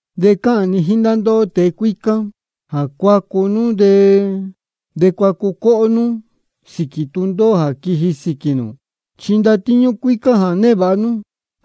De cáhān ni jíín ndá ndóhó tēe cuícá, jā cuacu nú de cuacu cóhó nú sīquī tūndóhó jā quiji sīquī nū. Chi ndatíñú cuícá jā névāha nú,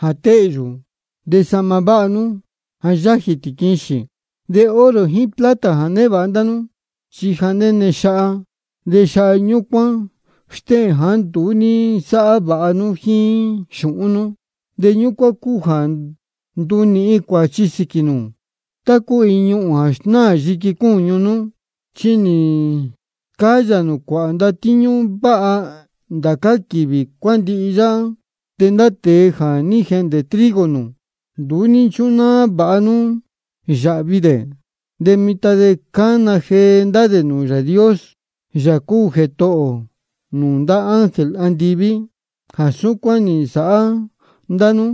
ja téhyū. De sahma váha nú, ja yájī tīquixīn. De oro jíín plata jā névāha ndá nú, chi ja néne xaha. De xaha ñúcuán stéhēn jāá nduú ní nsáhá vāha nú jíín xūhún nú. De ñúcuán cúu jā ndunīhin cuāchi sīquī nū, tá cúu iin ñuhūn jā snáā yiqui cúñu nú. Chi nī nascáyā cuāhā nū ndatíñú váha ndá quīvī cuándihi yáhá. De ndá tēe jā ní jehndē trigo nū, nduú ní nchúnáá vāha nú yāhvi dē. De mitan de cána jee ndá dē nūū Yāā Dios, Yāā cúu Jētohō nūū ndá ángel andiví, jā súcuán nī nsāhá ndá nú.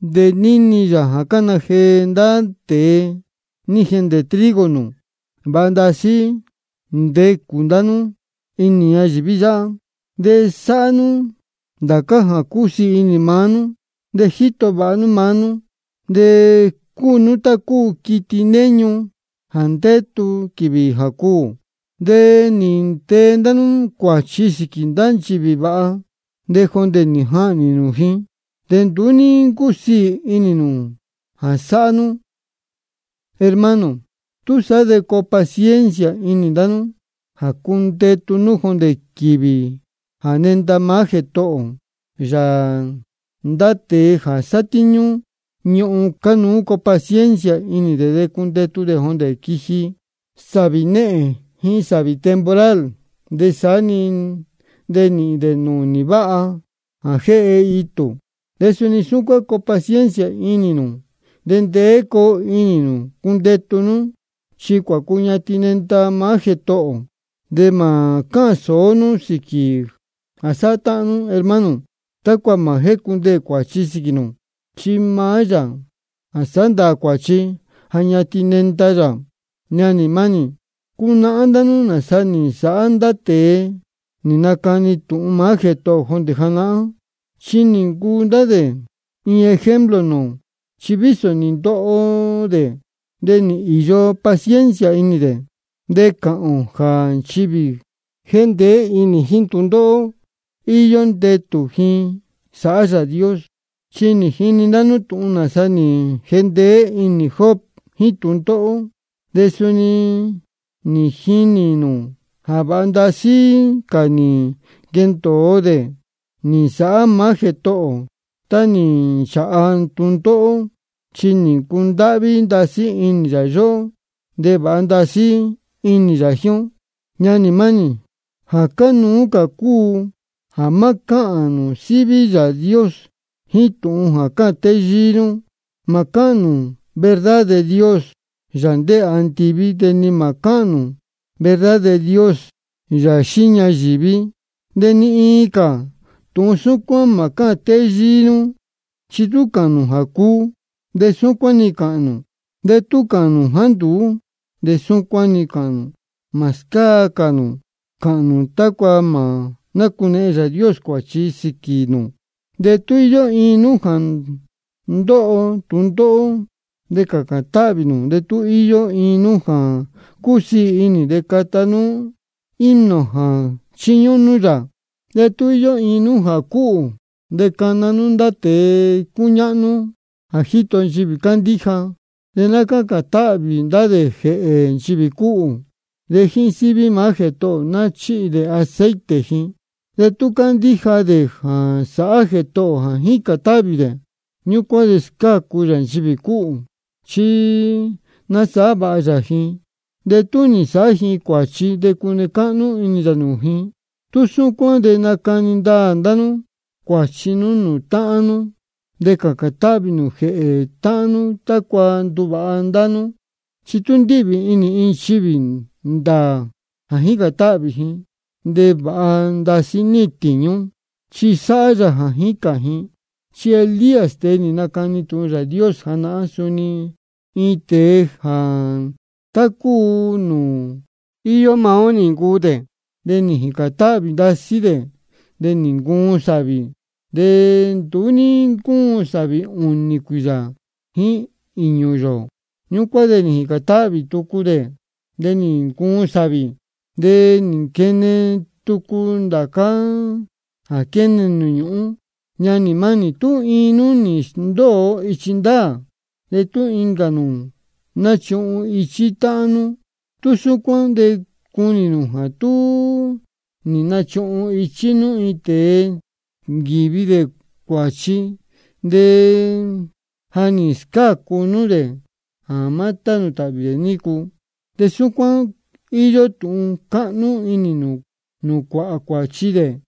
De níni yā jā cána jee ndá tēe nī jehndē trigo nū. Vāha ndasí técū ndá nú inī ñayīví yáhá, de sáhá nú ndācá jā cúsiī inī maá nú. De jíto vāha nú maá nú, de cúu nú tá cúu quiti néñu jā ndétu quīvī jā cuū. De nī ntee ndá nú cuāchi sīquī ndá nchivī vāha, de jondē nī jahnī nū ji. De nduú ní ncúu casī ji jā sáhá nú. Hermano, túsaá de coo paciencia inī ndá nú jā cundetu nú jondē quīvī jā nenda maá Jētohō ō. Ndá tēe jā sátíñú ñuhun, cánuú coo paciencia inī dē cundetu dē jondē quiji sāvī néhēn jíín sāvī temporal, de sá de nīhīn dē nūnī váha jā jéhe itū. De suni súcuán coo paciencia inī nū, de ndeé coo inī nū cundetu nú, chi cuācuñatin nenda maá Jētohō ō. De mā cáhān sōó nú sīquī jā sáhá táhán nú, hermano, tácua mā jícundeē cuāchi sīquī nū. Chi maá Yāā jā sāhá ndāā cuāchi, ja ñatin nenda yā. Ñanī mánī, cunahán ndá nú nāsa nī nsāhá ndá tēe nī nacani tūhun maá Jētohō ō jondē janahán, chi nī ncuu ndá dē iin ejemplo nūū ō. Chi vísō nī ndoho dē, de nī īyo paciencia inī dē. De cáhān ō jā nchivī jā jéndeé inī jíín tūndóhó, íyó ndetū ji sáhá Yāā Dios. Chi nī jini ndá nú tūhun nāsa nī jendeé inī Job jíín tūndóhó, de suni jínī nū jā vāha ndasí cā nī nquendōo dē nī nsāhá maá Jētohō ō tá nī nchāha tūndóhó. Chi cúndáhví ndasí inī yā yóhó, de vāha ndasí inī yā jíín ó. Ñanī mánī, jā cánuú cā cúu jā má cáhān nū síví Yāā Dios jíín tūhun jā cáhān téyíí nú. Mā cáhān nū verdad de Dios, Yāā ndéē andiví, de ni mā cáhān nū verdad de Dios, Yāā xíí ñayīví, de ni iin cā tūhun súcuán mā cáhān téyíí nú. Chi tú cāhān nū jā cuu, de súcuán-ni cāhān nū. De tú cāhān nū jāá nduú, de súcuán-ni cāhān nū. Mā scáa cā nū cāhān nū, tácua mā nácunehen Yāā Dios cuāchi sīquī nū. De tú íyó iin nú jā ndóho tūndóhó, de cācān táhvī nū. De tú íyó iin nú jā cúsiī inī, de cata nú himno jā chiñúhún nú yā. De tú íyó iin nú jā cúhū, de cana nú ndá tēe cúñáhnú jā jíto nchivī cándíja. De ná cácān táhvī ndá dē jēhē nchivī cúhū. De jíín síví maá Jētohō ō ná chíhi dē aceite ji. De tú cándíja dē jā sāhá Jētohō ō jā jícān táhvī dē, ñúcuán de scácu yā nchivī cúhū. Chi nasāhá vāha yā ji, de tú nī nsāhá ji cuāchi, de cune cáhnú inī yā nūū ji. Tú súcuán de nacani ndaā ndá nú cuāchi nú nūū táhán nú, de cācān táhvī nū jēhē táhán nú tácua nduvāha ndá nú. Chi tú ndíhvī inī iin nchivī ndāā jā jícān táhvī ji, de vāha ndasí níhīn tīñú, chi sáhá yā jā jícān ji. Chi Elías, tēe nī nacani tūhun Yāā Dios janahán, suni iin tēe jā tá cúu nūū íyó maá ó nī ncuu dē. De nī jīcān táhvī ndasí dē jā má cūún sāvī, de nduú ní ncúun sāvī ūnī cuīyā jíín īñū yōō. Ñúcuán de nī jīcān táhvī tucu dē, de nī ncuun sāvī, de nī nquene tucu ndācá jā quéne nūū ñūhún. Ñanī mánī, tú iin nú nī sndóo ichi ndāā, de tú incā nū nachuhun ichí nú táhán nú, tú súcuán de cunī nū jā tú nī nachuhun ichí nú tēe nī nquīvi cuāchi, de ja nī scácu nú dē jā tānū tāhvī dē nícu, de súcuán íyó tūhun cáhnú inī nūū cuāhā cuāchi dē.